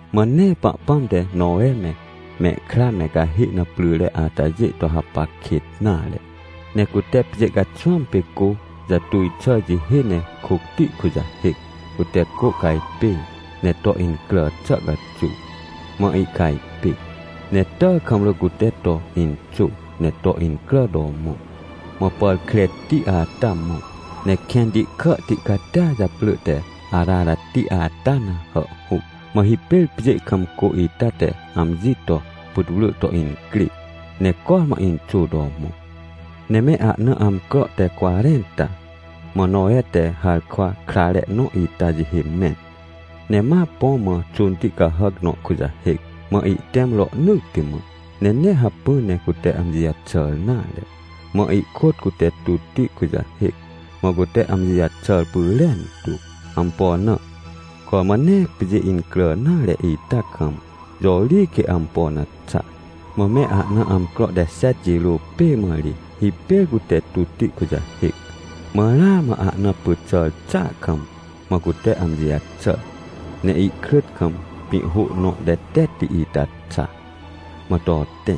Mã nee Pahpãm te Nowe me, mehkra me cahê na pryre atajê to hapac kêt nare. Ne cute pjê caxwãm pê cô jatuj xà jihê ne kôcti kujahêc, cute cô cajpêr, ne to incrà xà caxuw. Mã ihcajpê, ne tàkamrỳ cute to inxô ne to incrà to mõ, mã pàr kreti ata mõ, ne kẽnti kàhti catia japrỳ te Ararati ata na hàhhuc. Mã hipêr pjê kam cô ita te amji to putwrỳ to incrê, ne cormã inxô to mõ. Ne me ahna amcro te cwarẽnta, mã Nowe te harkwa krare nõ ita jihê mẽn, ne ma põ mã xônti cahàc nõ kujahêc. Mã ihtẽm rohnỳtti mã, ne nee hacpỹ ne cute amji jaxàr nare. Mã ihkôt cute tutti kujahêc, mã cute amji jaxàr pyrentu. Ampo na? Cormã nee pjê incrà nare ita kam, jõ ri quê ampo na xa? Mã me ahna amcro te xet jirô pê mã ri, hipêr cute tutti kujahêc. Mã ramã ahna pyt xàr xàa kam, mã cute amji jaxàr, ne ihkrỳt kam pĩ hô nõ tetetti ita xa, mã to tẽ.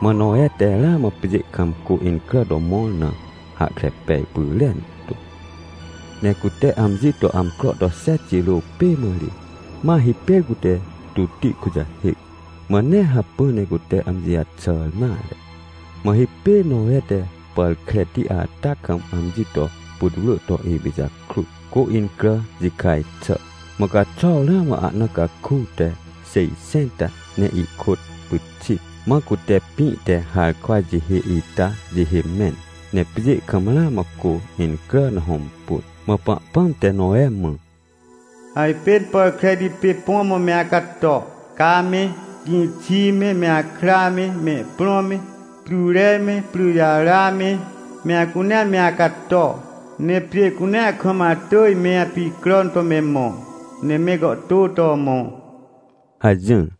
Mã Nowe te ramã pjê kam cô incrà to mõr na hahkre pej pyrentu. Ne cute amji to amcro to xet jirô pê mã ri, ma hipêr cute tutti kujahêc, mã nee hacpỹ ne cute amji jaxàr nare. Mã hipêr Nowe te pàr kreti ata kam amji to putwrỳ to ipijakrut, cô incrà jikaj xà, mã caxuaw ramã ahna caku te xêjxẽnta ne ihkôt pyxit. Mã cute pĩ te harkwa jihê ita jihê mẽn, ne pjê kam ramã cô incrà na hõmpun. Mã Pahpãm te Nowe mã: — Ajpên pàr kreti pê põ mã me acato. Ca me, gĩxi me, me akra me, mehprõ me, pryre me, pryjara me, me acunea me acato. Ne pjê cunea kam atỳj me apicràn to me mõ, ne me gàhtô to mõ — hajỹr.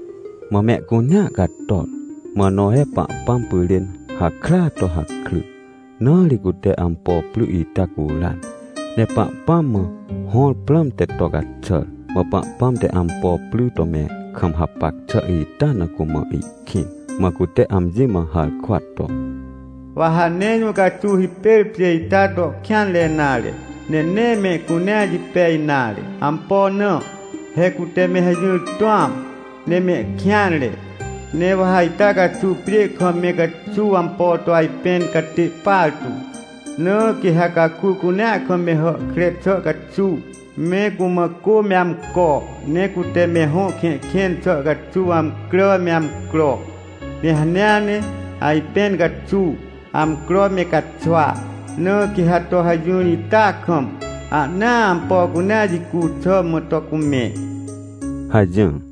Mã mehcunea japôj. Mã Nowe Pahpãm pyrên hakrya to hakry, na ri cute ampo pry ita curan, ne Pahpãm mã hõr prãmte to caxàr. Mã Pahpãm te ampo pry to me kam hapac xà ita na cumã ihkĩn, mã cute amji mã harkwa to: — Wa ha nee jũ caxuw hipêr pjê ita to kêanre nare, ne nee mehcunea jipej nare. Ampo na? He cute me hajỹr tũam, ne mehkêanre. Ne wa ha ita caxuw pjê kam me caxuw ampo to ajpẽn catê partu. Na quê ha caku cunea kam me hàhkre xà caxuw, me cumã cô me amco, ne cute me hõ kẽhkẽn xà caxuw amcrà me amcro, ne hanea ne, ajpẽn caxuw, amcro me caxwa. Na quê ha to hajỹr ita kam, ahnaa ampo cunea jicu xà mã to cumẽ — hajỹr.